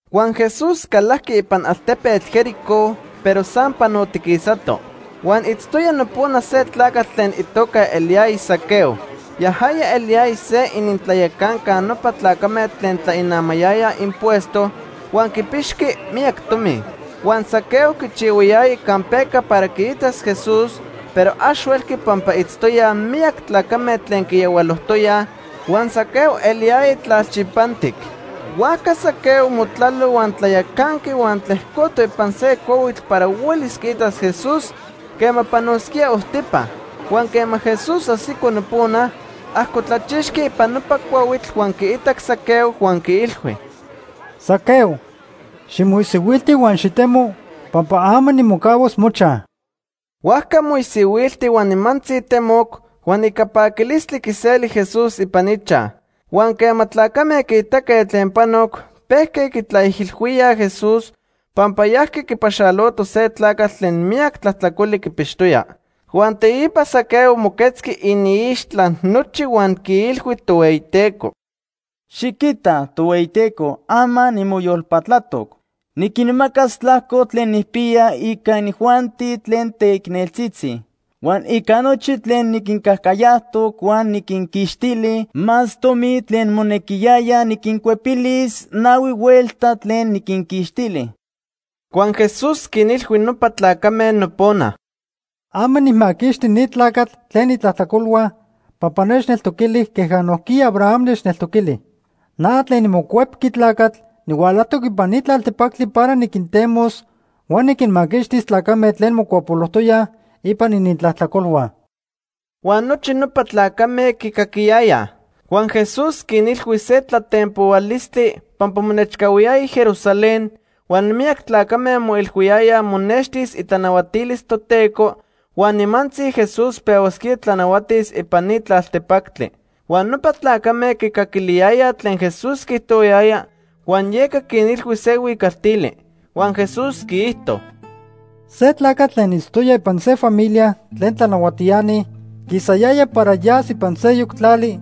Huan Jesús calajqui ipan altepetl Jericó, pero san panotiquisato. Huan itztoya nopona se tlacatl tlen itoca eliyaya Zaqueo. Yajaya eliyaya se inintlayacanca nopa tlacame tlen tlainamayayaj impuesto huan quipixqui miyac tomi. Huan Zaqueo quichihuayaya campeca para quiitas Jesús, pero ax huelqui pampa itztoyaj miyac tlacame tlen quiyahualojtoyaj, huan Zaqueo eliyaya tlalchipantic. Huajca Zaqueo motlalo huan tlayacanqui huan tlejcoto ipan se cuahuitl para huelis quiitas Jesús quema panosquía ojtipa. Huan quema Jesús ajsico nopona, ajcotlachixqui ipan nopa cuahuitl huan quiitac Zaqueo huan quiilhui: ―Zaqueo, ximoisihuilti huan xitemo, pampa ama nimocahuas mochaj. Huajca moisihuilti huan nimantzi temoc, huan ica paquilistli quiseli Jesús ipan ichaj. Huan quema tlacame quiitaque tlen panoc, pejque quitlaijilhuíaj Jesús pampa yajqui quipaxaloto se tlacatl tlen miyac tlajtlacoli quipixtoya. Huan teipa Zaqueo moquetzqui iniixtla nochi huan quiilhui Tohueyiteco: ―Xiquita, Tohueyiteco, ama nimoyolpatlatoc. Niquinmacas tlajco tlen nijpiya ica inijuanti tlen teicneltzitzi. Huan ica nochi tlen niquincajcayajtoc huan niquinquixtili más tomi tlen monequiyaya, niquincuepilis nahui huelta tlen niquinquixtili. Huan Jesús quinilhui nopa tlacame nopona: ―Ama nijmaquixti ni tlacatl tlen itlajtlacolhua pampa nechneltoquili queja nojquiya Abraham nechneltoquili. Na tlen niMocuepqui Tlacatl nihualajtoc ipan ni tlaltepactli para niquintemos huan niquinmaquixtis tlacame tlen mocuapolojtoyaj ipan inintlajtlacolhua. Huan nochi nopa tlacame quicaquiyayaj. Huan Jesús quinilhui se tlatenpohualistli pampa monechcahuiyaya Jerusalén, huan miyac tlacame moilhuiyayaj monextis itlanahuatilis Toteco huan nimantzi Jesús pehuasquía tlanahuatis ipan ni tlaltepactli. Huan nopa tlacame quicaquiliyayaj tlen Jesús quiijtohuayaya huan yeca quinilhui se huicaltili. Huan Jesús quiijto: “Se tlacatl tlen itztoya ipan se familia tlen tlanahuatiani quisayaya para yas ipan seyoc tlali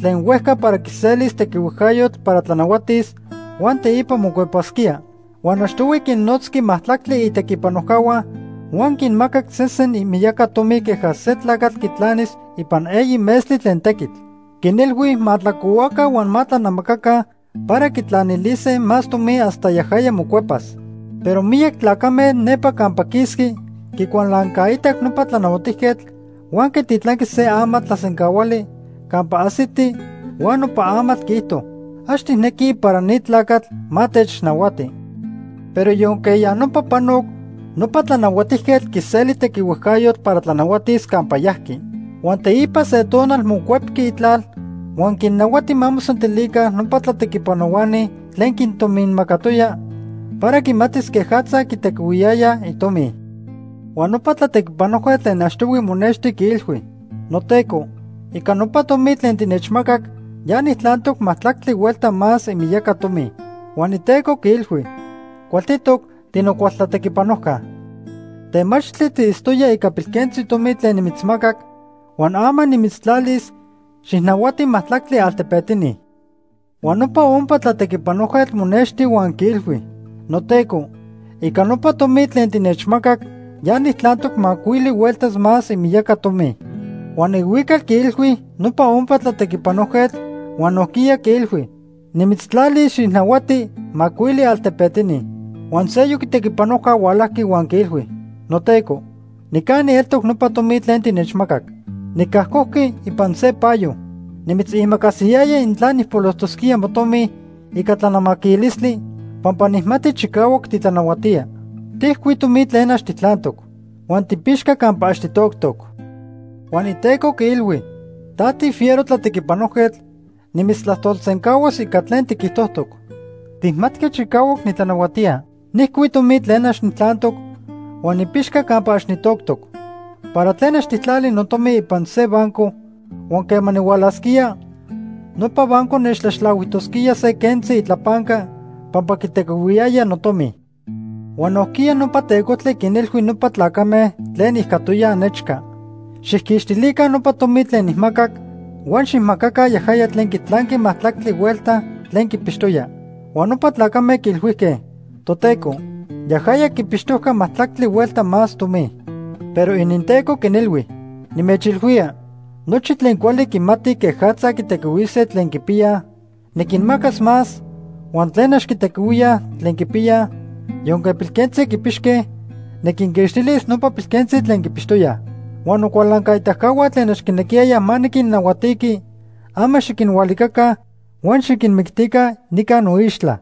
tlen huejca para quiselis tequihuejcayotl para tlanahuatis, huan teipa mocuepasquía. Huan achtohui quinnotzqui majtlactli itequipanojcahua huan quinmacac se sen imiyaca tomi queja se tlacatl quitlanis ipan eyi metztli tlen tequitl. Quinilhui ma tlacohuaca huan ma tlanamacaca para quitlanilise más tomi hasta yajaya mocuepas. Pero miyac tlacame nepa campa quisqui quicualancaitac nopa tlanahuatijquetl huan quititlanque se amatl tlasencahuali campa ajsiti huan nopa amatl quiijto: ‘Ax tijnequij para ni tlacatl ma technahuati.’ “Pero yonque ya nopa panoc, nopa tlanahuatijquetl quiseli tequihuejcayotl para tlanahuatis campa yajqui. Huan teipa se tonal mocuepqui itlal huan quinnahuati ma mosentilica nopa tlatequipanohuani tlen quintominmacatoya para quimatis quejatza quitequihuiyayaj itomi. Huan nopa tlatequipanojquetl tlen achtohui monexti, quiilhui: ‘Noteco, ica nopa tomi tlen tinechmacac ya nijtlantoc majtlactli huelta más imiyaca tomi.’ Huan iteco quiilhui: ‘Cualtitoc, tinocual tlatequipanojca. Temachtli tiitztoya ica pilquentzi tomi tlen nimitzmacac, huan ama nimitztlalis xijnahuati majtlactli altepetini.’ Huan nopa ompa tlatequipanojquetl monexti huan quiilhui: ‘Noteco, ica nopa tomi tlen tinechmacac, ya nijtlantoc macuili hueltas más imiyaca tomi.’ Huan ihuical quiilhui nopa ompa tlatequipanojquetl huan nojquiya quiilhui: ‘Nimitztlalis xijnahuati macuili altepetini.’ “Huan seyoc itequipanojca hualajqui huan quiilhui: ‘Noteco, nicani eltoc nopa tomi tlen tinechmacac. Nicajcojqui ipan se payo. Nimitzimacasiyaya intla nijpolojtosquía motomi ica tlanamaquilistli, pampa nijmati chicahuac titlanahuatía. Tijcui tomi tlen ax tijtlantoc huan tipixca campa ax titoctoc.’ Huan iteco quiilhui: ‘Ta tifiero tlatequipanojquetl, nimitztlajtolsencahuas ica tlen tiquijtojtoc. Tijmatqui chicahuac nitlanahuatía. Nijcui tomi tlen ax nijtlantoc huan nipixca campa ax nitoctoc. ¿Para tlen ax tijtlali notomi ipan se banco, huan quema nihualasquía, nopa banco nechtlaxtlahuijtosquía se quentzi itlapanca pampa quitequihuiyaya notomi?’ “Huan nojquiya nopa tecojtli quinilhui nopa tlacame tlen ijcatoyaj nechca: ‘Xijquixtilica nopa tomi tlen nijmacac, huan xijmacaca yajaya tlen quitlanqui majtlactli huelta tlen quipixtoya.’ Huan nopa tlacame quiilhuijque: ‘Toteco, yajaya quipixtojca majtlactli huelta más tomi.’ “Pero ininteco quinilhui: ‘Nimechilhuía, nochi tlen cuali quimati quejatza quitequihuise tlen quipiyaj, niquinmacas más, huan tlen ax quitequihuía tlen quipiyaj, yonque pilquentzi quipixque, niquinquixtilis nopa pilquentzi tlen quipixtoyaj. Huan nocualancaitacahua tlen ax quinequiyayaj ma niquinnahuatiqui, ama xiquinhualicaca huan xiquinmictica nica noixtla.’”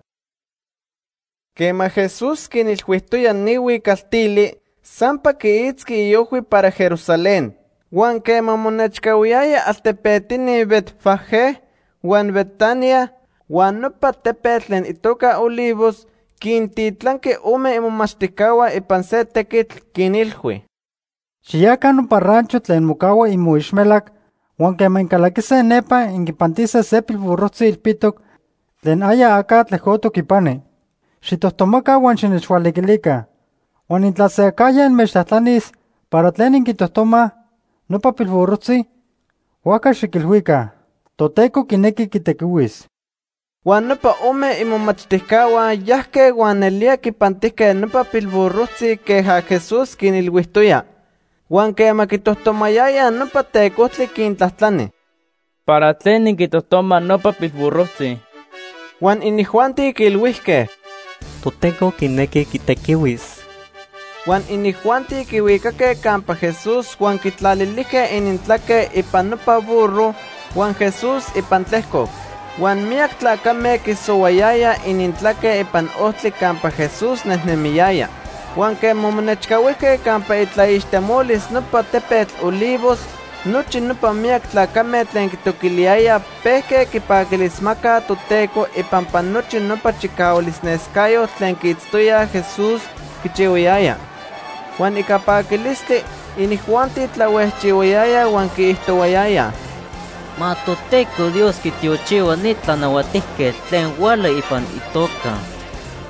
Quema Jesús quinilhuijtoya ni huicaltili, sampa quiitzqui iojhui para Jerusalén. Huan quema monechcahuiyaya altepetini Betfagé huan Betanía huan nopa tepetl tlen itoca Olivos, quintitlanqui ome imomachtijcahua ipan se tequitl, quinilhui: ―Xiyaca nopa rancho tlen mocahua imoixmelac huan quema incalaquise nepa inquipantise se pilburrojtzi ilpitoc tlen aya aca tlejcotoc ipani. Xijtojtomaca huan xinechhualiquilica. Huan intla se acajya inmechtlajtlanis para tlen inquitojtomaj, nopa pilburrojtzi, huajca xiquilhuica: ‘Toteco quinequi quitequihuis.’ Huan nopa ome imomachtijcahua yajque huan nelía quipantijque nopa pilburrojtzi queja Jesús quinilhuijtoya. Huan quema quitojtomayayaj, nopa tecojtli quintlajtlani: ―¿Para tlen inquitojtomaj nopa pilburrojtzi? Huan inijuanti quiilhuijque: ―Toteco quinequi quitequihuis. Huan inijuanti quihuicaque campa Jesús huan quitlalilijque inintlaque ipan nopa burro huan Jesús ipan tlejcoc. Huan miyac tlacame quisohuayayaj inintlaque ipan ojtli campa Jesús nejnemiyaya. Huan quema monechcahuijque campa itlaixtemolis nopa tepetl Olivos, nochi nopa miyac tlacame tlen quitoquiliyayaj pejque quipaquilismacaj Toteco ipampa nochi nopa chicahualnescayotl tlen quiitztoyaj Jesús quichihuayaya. Huan ica paquilistli, inijuanti tlahuejchihuayayaj huan quiijtohuayayaj: “¡Ma Toteco Dios quitiochihua ni tlanahuatijquetl tlen huala ipan itoca!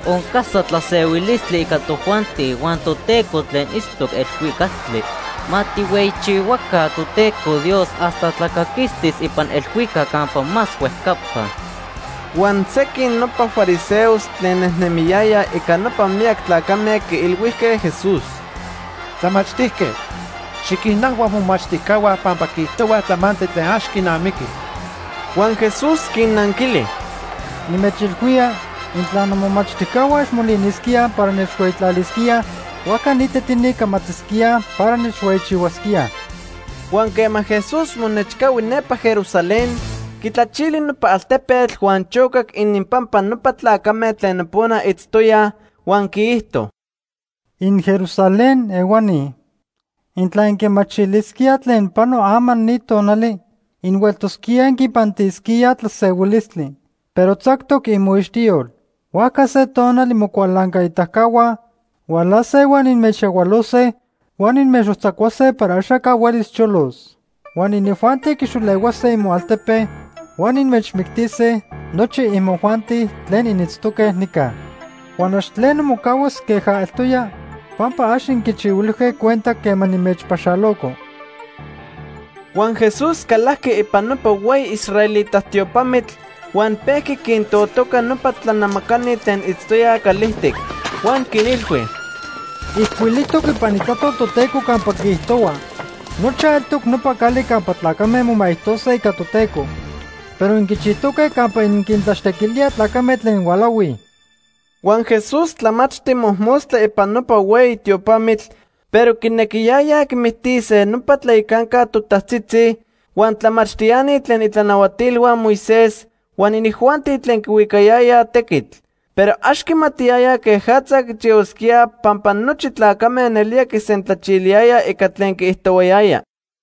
Oncasa tlasehuilistli ica tojuanti huan Toteco tlen itztoc elhuicactli. ¡Ma tijhueyichihuaca Toteco Dios hasta tlacaquistis ipan elhuicac campa más huejcapa!” Huan sequin nopa fariseos tlen nejnemiyayaj ica nopa miyac tlacame quiilhuijque Jesús: ―Tlamachtijquetl, xiquinajhua momachtijcahua pampa quiijtohuaj tlamantli tlen ax quinamiqui. Huan Jesús quinnanquili: ―Nimechilhuía intla nomomachtijcahua ax molinisquíaj para nechhueyitlalisquíaj, huajca ni tetini camatisquíaj para nechhueyichihuasquíaj. Huan quema Jesús monechcahui nepa Jerusalén, quitlachili nopa altepetl huan chocac ininpampa nopa tlacame tlen nopona itztoyaj, huan quiijto: “InJerusalén ehuani, intla inquimachilisquíaj tlen pano ama ni tonali, inhueltosquíaj inquipantisquíaj tlasehuilistli. Pero tzactoc imoixtiyol. Huajca se tonal imocualancaitacahua hualase huan inmechyahualose huan inmechojtzacuase para axaca huelis cholos. Huan inijuanti quixolehuase imoaltepe huan inmechmictise nochi imojuanti tlen initztoque nica. Huan ax tleno mocahuas queja eltoya pampa ax inquichihuilijque cuenta quema nimechpaxaloco.” Huan Jesús calajqui ipan nopa hueyi israelita tiopamitl huan pejqui quintotoca nopa tlanamacani tlen itztoyaj calijtic. Huan quinilhui: ―Ijcuilijtoc ipan Itlajtol Toteco campa quiijtohua: ‘Nochaj eltoc nopa cali campa tlacame momaijtose ica Toteco.’ Pero inquichijtoque campa inquintlaxtequilíaj tlacame tlen hualahuij. Huan Jesús tlamachti mojmostla ipan nopa hueyi tiopamitl, pero quinequiyayaj quimictise nopa tlayacanca totajtzitzi, huan tlamachtiani tlen itlanahuatilhua Moisés, huan inijuanti tlen quihuicayayaj tequitl. Pero ax quimatiyayaj quejatza quichihuasquíaj pampa nochi tlacame nelía quisentlacaquiliyayaj ica tlen quiijtohuayaya.